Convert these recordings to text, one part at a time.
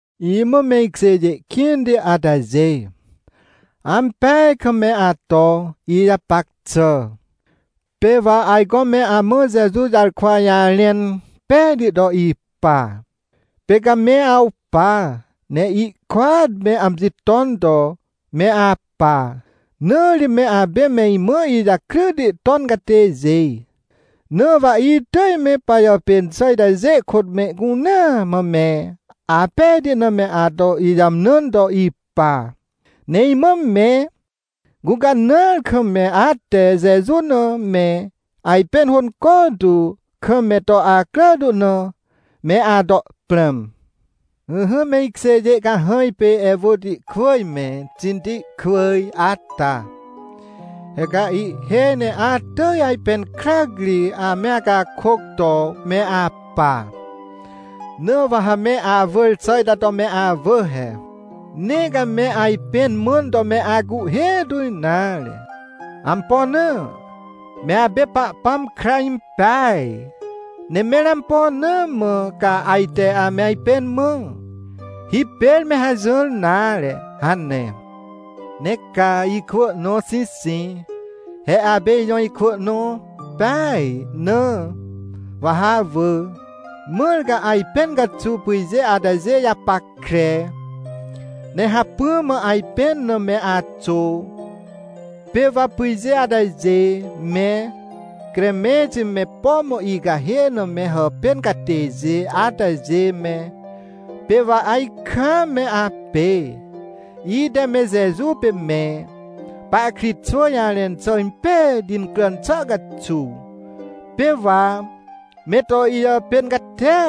Imã me ikjêjê kĩnti atajê, ampeaj kam me ato ijapac xà! Pê wa ajco me amã Jeju jarkwa jarẽn pejti to ipa, pê ca me awpa ne ihkôat me amji ton to me apa, na ri me apê me imã ijakryti ton catêjê. Na wa itỳj me pajàpên xà itajê kôt mehcunea mã me apejti na me ato ijàmnãn to ipa. Ne imã me gũcanãar kam me ate Jeju na me ajpẽn hônco tu kam me to acrà tu na, me ato prãm. Ỹhỹ me ikjêjê cahãj pê Ewotikwỳj me, Xintikwỳj ata, he ca ihhêj ne atỳj ajpẽn krac ri ame acakôc to me apa, na wa ha me awỳr xà ita to me awỳ he: — Nee ca me ajpẽn mãn to me acuhhê tu nare. Ampo na? Me apê Pahpãm kra impeaj. Ne mẽr ampo na mã ca ajte ame ajpẽn mã? Hipêr me hajỹr nare — hane. Ne ca, ikwỳ nõ Xixic, he apê ijõ ikwỳ nõ peaj, na wa ha awỳ, mãr ca ajpẽn caxuw pyjê atajê japackre, ne hacpỹ mã ajpẽn na me axô. Pê wa pyjê atajê me, Cremẽnti me, por icahê na me hàpên catêjê atajê me, pê wa ajkaam me apê, ite me Jeju pê me pahkritxwỳ jarẽn xà impejti incràn xà caxuw, pê wa me to ijàpên catia.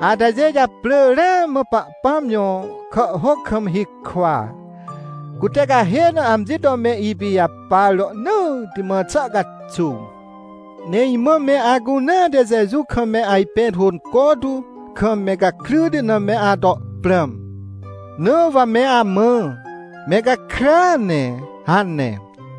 Atajê japrỳ ramã Pahpãm jõ kàhhôc kam hikwa, cute cahê na amji to me ipijapar rohnỳtti mã xà caxuw. Ne imã me acunea te Jeju kam me ajpẽn hônco tu kam me gakryti na me ato prãm. Na wa me amã: — Me gakrya ne — hane!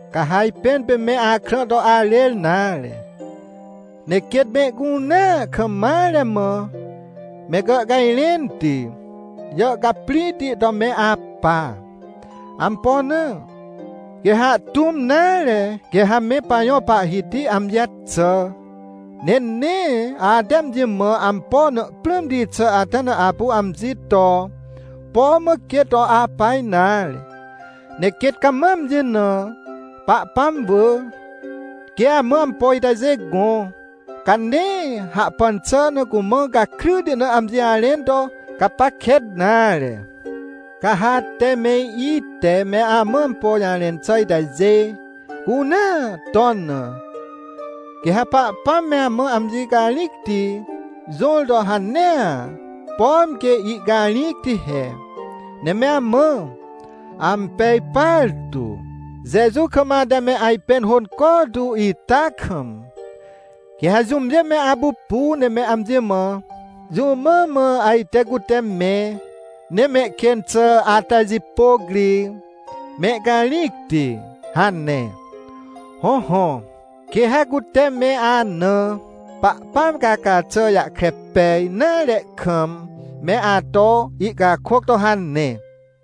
Ca ha ajpẽn pê me akrã to arêr nare, ne quêt mehcunea kam mare mã me gàhcajrẽnti, jàhcaprĩhti to me apa. Ampo na? Quê ha ahtũm nare, quê ha me pajõ Pahhiti amji jaxà. Ne nee ate amji mã ampo na prãmti xà ata na apu amji to põ mã quê to apa nare, ne quêt cama amji na Pahpãm wỳ. Quê amã ampo itajê gõ, ca nee hahpan xà na cumã gakryti na amji jarẽn to gapac kêt nare. Ca ha ate me ite me amã ampo jarẽn xà itajê cunea ton na, quê ha Pahpãm me amã amji carĩcti jõr to hanea, pom quê ihcarĩcti he, ne me amã ampej partu, Jeju kam ate me ajpẽn hônco tu ita kam. Quê ha jũmjê me apupu ne me amji mã: — Jũ mã mã ajte cute me, ne mehkên xà atajipôc ri mehcarĩcti? — hane. Hõhõ, quê ha cute me ana Pahpãm caca xà jahkre pej nare kam, me ato ihcakôc to hane.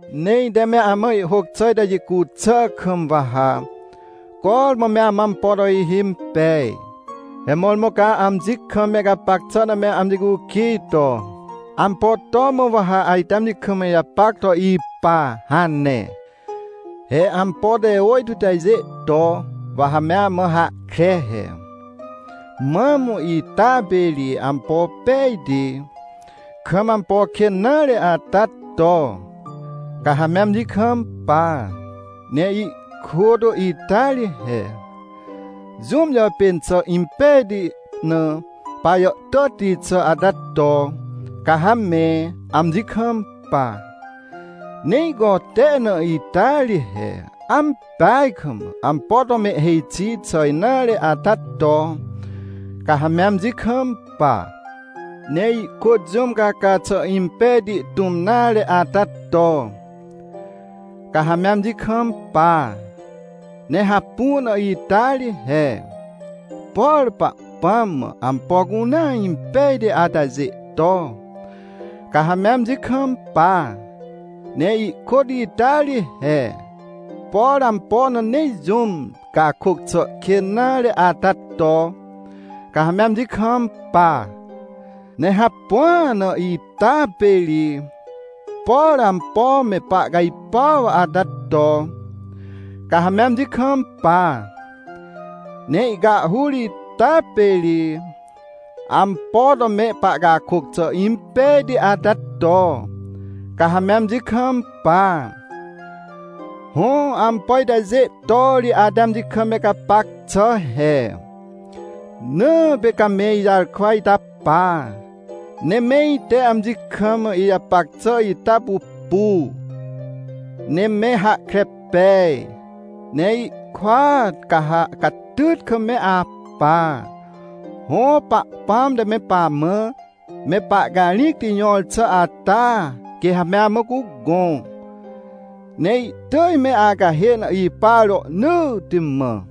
Ne ite me amã ihhôc xà ita jicu xà kam wa ha cormã me amã ampo to ihimpej. He mõrmõ ca amji kam me gapac xà na me amji cukij to: — Ampo to mã wa ha ajte amji kam ijapac to ipa? — hane. He, ampo te ôjtô itajê to, wa ha me amã hahkre he: Mam ita pê ri ampo pejti, kam ampo kên nare ata to, ca ha me amji kampa. Ne ihkôt ita ri he, jũm jàpên xà impejti na pajàhtàtti xà ata to, ca ha me amji kampa. Ne ihcote na ita ri he, ampeaj kam ampo to mehhêj xi xà nare ata to, ca ha me amji kampa. Ne ihkôt jũm caca xà impejti tũm nare ata to, ca ha me amji kampa. Ne hapu na ita ri he, por Pahpãm mã ampo cunea impejti atajê to, ca ha me amji kampa. Ne ihkôt ita ri he, por ampo na nee jũm cakôc xà kên nare ata to, ca ha me amji kampa. Ne hapua na ita pê ri, por ampo me pahcajpuaw ata to, ca ha me amji kampa. Ne ihcahhur ita pê ri, ampo to me pahcakôc xà impejti ata to, ca ha me amji kampa. Hõ, ampo itajê to ri ate amji kam me gapac xà he. Na pê ca me ijarkwa ita pa, ne me ite amji kam ijapac xà ita pupu, ne me hahkre pej, ne ihkôat ca ha catyt kam me apa. Hõ, Pahpãm te me pamã me pahcarĩcti jõr xà ata quê ha me amã cugõ, ne ihtỳj me acahê na ipa rohnỳtti mã.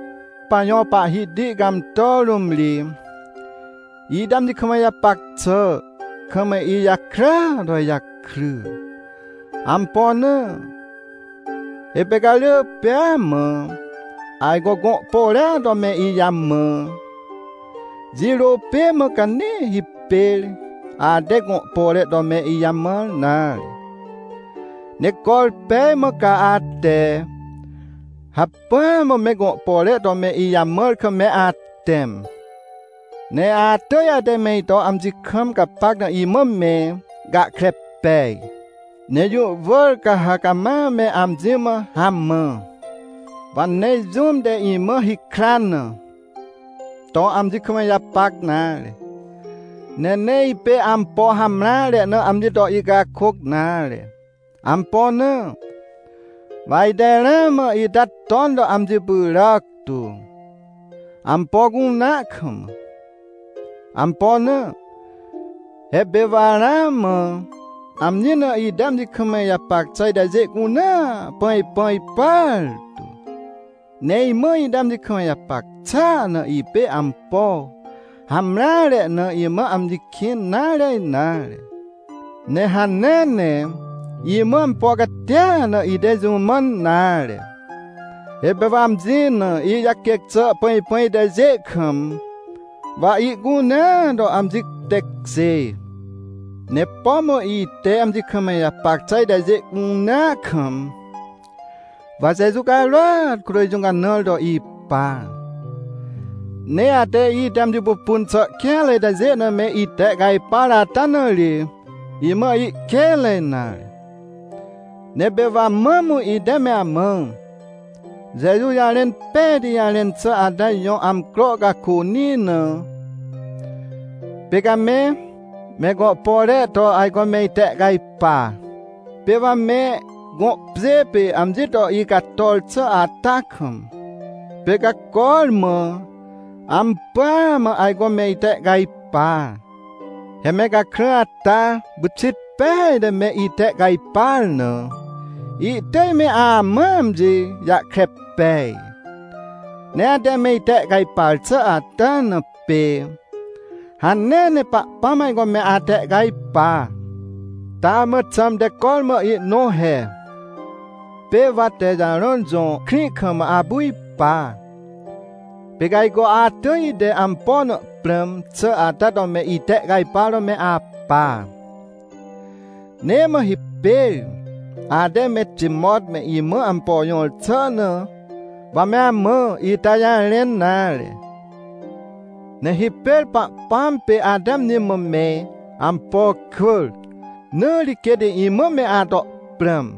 Pajõ Pahhiti cãmtà rũm ri, ite amji kam ijapac xà kam ijakrya to ijakry. Ampo na? He pê ca rỳ pêa mã ajco gõ pore to me ijamã. Jirô pê mã ca nee hipêr ate gõ pore to me ijamãr nare. Ne corpej mã ca ate hacpỹa mã me gõ pore to me ijamãr kam me atẽm. Ne atỳj ate me ito amji kam gapac na imã me gahkre pej, ne jũ wỳr ca ha cama me amji mã hamã. Wa nee, jũm te imã hikran na, to amji kam ijapac nare, ne nee ipê ampo hamreare na amji to icakôc nare. Ampo na? Wa ite ramã ita ton to amji pyràc tu, ampo cunea kam. Ampo na? He pê wa ramã amji na ite amji kam ijapac xà itajê cunea pãjpãj partu. Ne imã ite amji kam ijapac xàa na ipê ampo hamreare na, imã amji kĩn nare nare, ne hanea ne imã ampo catia na ite jũ mãn nare. He pê wa amji na ijaquêc xà pãjpãj itajê kam, wa ihcunea to amji tekjê. Ne pom ite amji kam ijapac xà itajê cunea kam, wa Jeju carôat kôt ijũcanãr to ipa. Ne ate ite amji pupun xà kêanre itajê na me itehcajpar ata na ri, imã ihkênre nare. Ne pê wa mam ite me amã Jeju jarẽn pejti jarẽn xà ata jõ amcro cakônĩ na, pê ca me, me gõ pore to ajco me itehcajpa. Pê wa me gõ pjê pê amji to icator xà ata kam, pê ca cormã ampỳa mã ajco me itehcajpa. He me gakrã ata pyxit peaj te me itehcajpar na, ihtỳj me amãa amji jahkre pej. Ne ate me itehcajpar xà ata na, pê hanea ne Pahpãm ajco me atehcajpa. Taa mã xãmte cormã ihnõ he. Pê wa Texarõn jõ krĩ kam apu ipa, pê ca ajco atỳj ite ampo na prãm xà ata to me itehcajpar to me apa. Nee mã hipêr ate me Timot me imã ampo jõr xà na, wa me amã ita jarẽn nare, ne hipêr Pahpãm pê ate amji mã me ampo cwỳr, na ri quêt imã me ato prãm.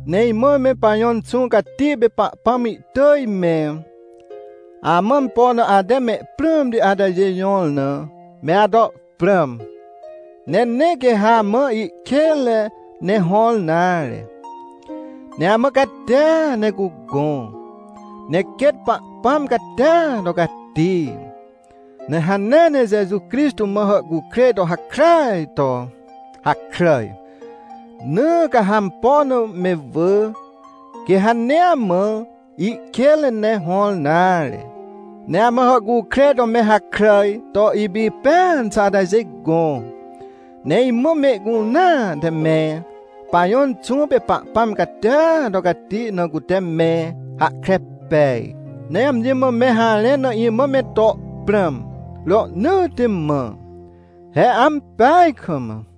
Ne imã me pajõ Inxũ Cati pê Pahpãm ihtỳj me amã ampo na ate mehprãmti atajê jõr na, me ato prãm. Ne nee quê ha amã ihkênre ne hõr nare, ne amã catia ne cugõ. Ne quêt Pahpãm catia to cati, ne hanea ne Jeju Crixtô mã hàhcukrêj to hakràaj to hakràj, na ca ha ampo na me wỳ, quê ha nee amã ihkênre ne hõr nare, ne amã hàhcukrêj to me hakràj to ipipẽan xà atajê gõ. Ne imã mehcunea te me pajõ Inxũ pê Pahpãm catia to cati na, cute me hahkre pej ne amji mã me harẽn na imã me to prãm, rohnỳtti mã. He ampeaj kam!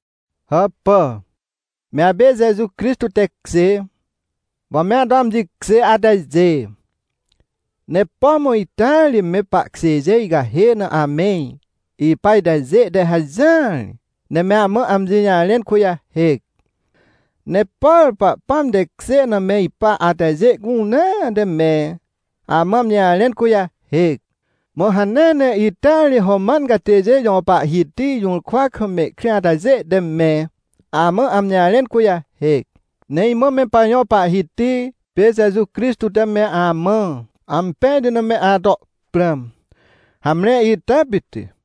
Hàpà, me apê Jeju Crixtô tekjê, wa me ato amji kjê atajê. Ne pom ita ri me pahkjêjê icahê na ame ipa itajê te hajỹar ne me amã amji jarẽn kujahêc. Ne por Pahpãm tekjê na me ipa atajê cunea te me amã amji jarẽn kujahêc. Mã hanea ne ita ri Roman catêjê jõ pahhiti jũrkwa kam mehkrĩ atajê te me amã amji jarẽn kujahêc. Ne imã me pajõ Pahhiti pê Jeju Crixtô te me amã ampejti na me ato prãm. Hamre, ita pit.